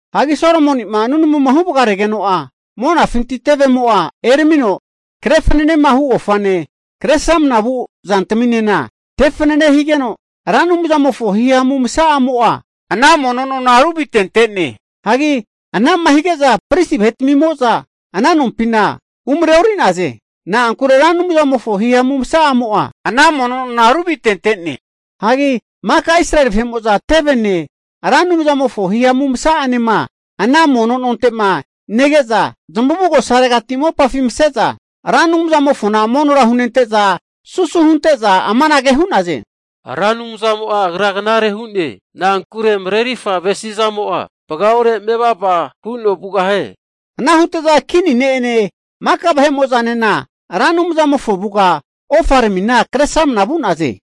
Hagi Solomoni'ma nunamuma huvagaregeno'a, monafinti tevemo'a eramino kre fananehu ofane, kre sramanama vu zantaminena tefanane higeno, Ra Anumzamofo hihamu masa'amo'a ana mono nona ruvitente'ne. Hagi ana'ma hige'za pristi vahetmimo'za ana nompina umreori'naze, na'ankure Ra Anumzamofo hihamu masa'amo'a ana mono nona ruvitente'ne. Hagi maka Israeli vahe'mo'za tevene, Ra Anumzamofo hihamu masa'anema ana mono nonte'ma nege'za, zamavugosaregati mopafi mase'za Ra Anumzamofona monora hunente'za, susu hunte'za amanage hu'naze, Ra Anumzamo'a Agra knare hu'ne. Na'ankure marerirfa avesi'zamo'a vagaore mevava huno vugahie. Ana hute'za, kini ne'ene maka vahe'mo'zanena Ra Anumzamofo avuga ofaramina kresramna vu'naze.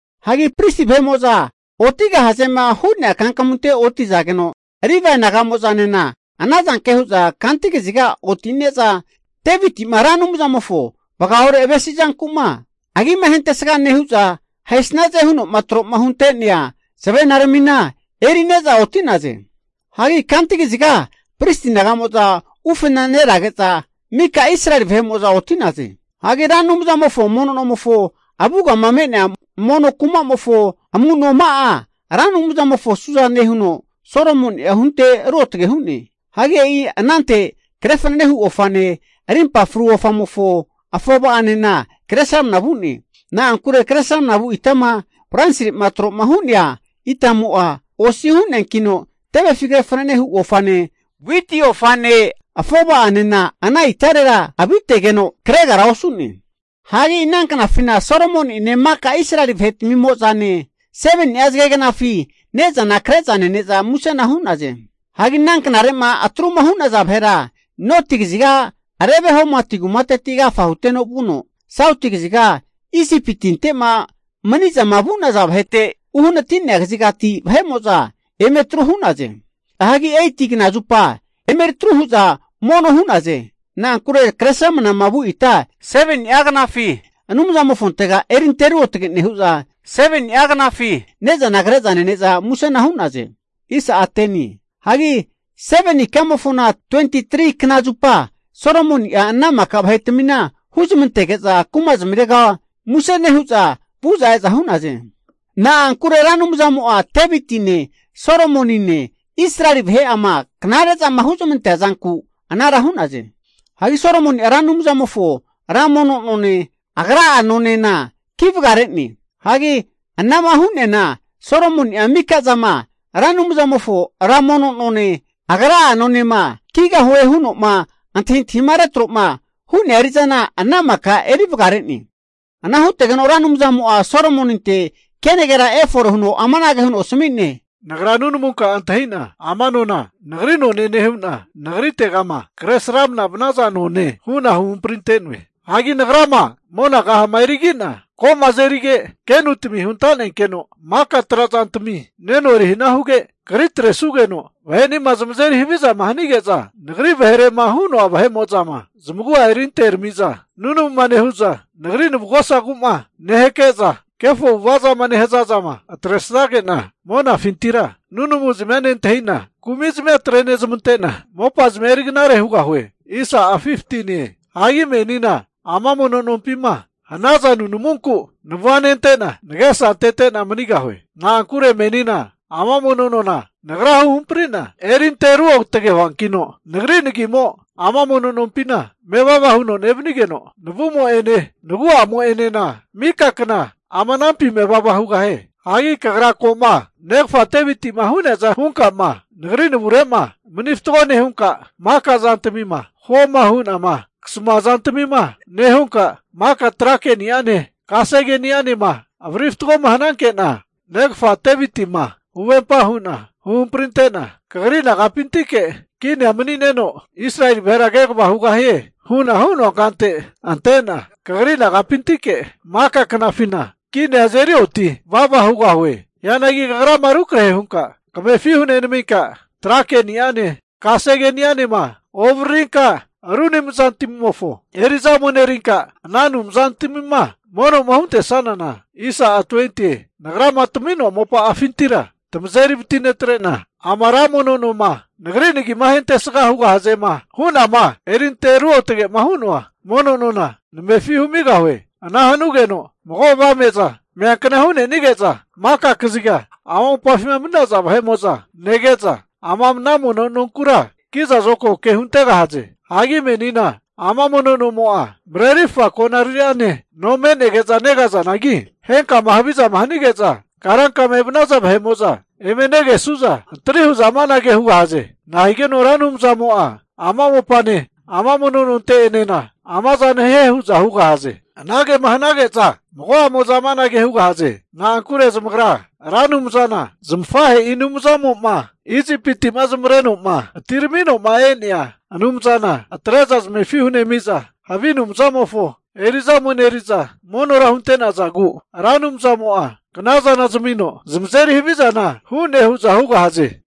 Hagi pristi vahe'mo'za otigahazema hu'nea kankamunte otizageno, Livae naga'mo'zanena ana zanke hu'za kanti kaziga otine'za, Deviti'ma Ra Anumzamofo vagaore avesi zanku'ma agima ahentesga nehu'za, ahesnaze hu'noma tro'ma hunte'nea zavenaramina eri'neza oti'naze. Hagi kanti kaziga pristi naga'mo'za ufenerage'za mika Israeli vahe'mo'za oti'naze. Hagi Ra Anumzamofo mono nomofo avugama me'nea mono kumamofo amu'noma'a, Ra Anumzamofo suzane huno Solomoni'a hunte ruotage hu'ne. Hagi e'i anante kre fananehu ofane, rimpa fru ofamofo afova'anena kresramna vu'ne. Na'ankure kresramna vu itama bronsire'ma tro'ma hu'nea itamo'a, osi hu'neankino tevefi kre fanane hu ofane, witi ofane afova'anena ana itarera avitegeno kregara osu'ne. Hagi ana knafina Solomoni'ene maka Israeli vahetmimo'zane 7ni'a zagegnafi ne'zana kre'za nene'za musena hu'naze. Hagi ana knare'ma atruma hu'naza vahera, noti kaziga Lebo-Hamati kumateti agafa huteno vuno, sauti kaziga Isipi tinte'ma mani'zama vu'naza vahete uhanati'nea kazigati vahe'mo'za eme atru hu'naze. Hagi 8ti kna zupa emeritru hu'za mono hu'naze. Na'ankure kresramnama vu ita 7ni'a knafi Anumzamofontega erinte ruotge nehu'za, 7ni'a knafi ne'zana kre'za nene'za musena hu'naze. Hagi seveni ikamofona 23knazupa, Solomoni'a ana maka vahetmina huzamantege'za kumazmirega muse nehu'za vu'za eza hu'naze. Na'ankure Ra Anumzamo'a, Devitine, Solomonine, Israeli vahe'ama knare'zama huzmante'nea zanku anara hu'naze. Hagi Solomoni'a Ra Anumzamofo ra mono None, agra'a nonena ki vagare'ne. Hagi anama hu'neana Solomoni'a mika zama Ra Anumzamofo Ra Mono none, agra'a nonema kigahuema huno antahintahima retro'ma hu'nea eri'zana, ana maka eri vagare'ne. Ana hutegeno Ra Anumzamo'a Solomoninte kenagera efore huno amanage huno asmi'ne, Nagra nunamunka'a antahi'na ama nona nagri none nehu'na nagritegama kresramna vanaza none hu'na huhamprintoe. Hagi Nagrama mona kahama erigi'na ko'ma azerige, kenutmi huntanenkeno maka trazantami neno eri hana huge, kri atresugeno vahe'nima zamazeri haviza hanige'za, Nagri vaherema hu'noa vahe'mo'zama zamagu'a erinterami'za, nunamuma nehu'za, nagri navugosagu'ma nehake'za, kefo avu'ava'zama nehaza zama atresage'na, monafintira nunamu'zmia nentahi'na kumizmia atre'nezmante'na, mopazmia eri knare hugahue. Hagi menina ama mono nompima hanaza nunamunku navua nente'na nagesa antete'na manigahue. Na'ankure menina ama mono nona Nagra huhampri'na erinte ruotge huankino, nagri nagimo ama mono nompina mevava huno nevanigeno, navumo'ene nagu'amo'enena mika kna ama anampi mevava hugahie. Hagi kagra ko'ma negafa Deviti'ma hu'neaza hunkama Nagri navure'ma mani fatgo nehunka, maka zantmima huoma hu'nama kasamua zantmima nehunka, maka tra ke'niane, kasegeni'anema avariri fatgoma hananke'na, negafa Devitima huvempama hu'na huhamprinte'na, kagri nagapintike kinia mani'neno Israeli vahera kegavama hugahie hu'na hu'noa kante ante'na, kagri nagapintike maka knafina kinia azeri oti vava hugahue. Hianagi kagrama rukrahe hunka kamefi hunenaminka, trake'ni'ane, kasegeni'anema ovaririnka, ru anumzantmimofo eri'za ome'nerinka, ana anumzantamima mono'ma huntesanana, Nagrama tami'noa mopani'afintira tamazeri vatinetre'na, ama ra mono noma Nagri nagi ahentesga hugahazema hu'nama erinte ruotage'ma hu'noa mono nona namefi humigahue. Ana hanugeno mago avame'za meankna hu'nenige'za maka kaziga ama mopafima mani'naza vahe'mo'za nege'za, ama ana mono nonkura kizazokago ke huntegahaze. Hagi menina ama Mono nomo'a marerirfa konariri'ane no me'nege'za negazanagi, henkama havizama hanige'za karankama evanaza vahe'mo'za eme negesu'za, antri hu'za amanage hugahaze, nahigeno Ra Anumzamo'a ama mopane ama mono nonte'enena amazana hie hu'za hugahaze. Anagema hanage'za mago'amoza amanage hugahaze, na'ankure zamagra Ra Anumzana zamafahe'i Anumzamo'ma Isipiti'ma zamavareno'ma atiramino'ma e'nea Anumzana atre'za zamefi hunemi'za, havi anumzantmimofo eri'za omeneri'za, monora hunte'nazagu Ra Anumzmo'a knazana zamino zamazeri havizana hu'ne huza hugahaze.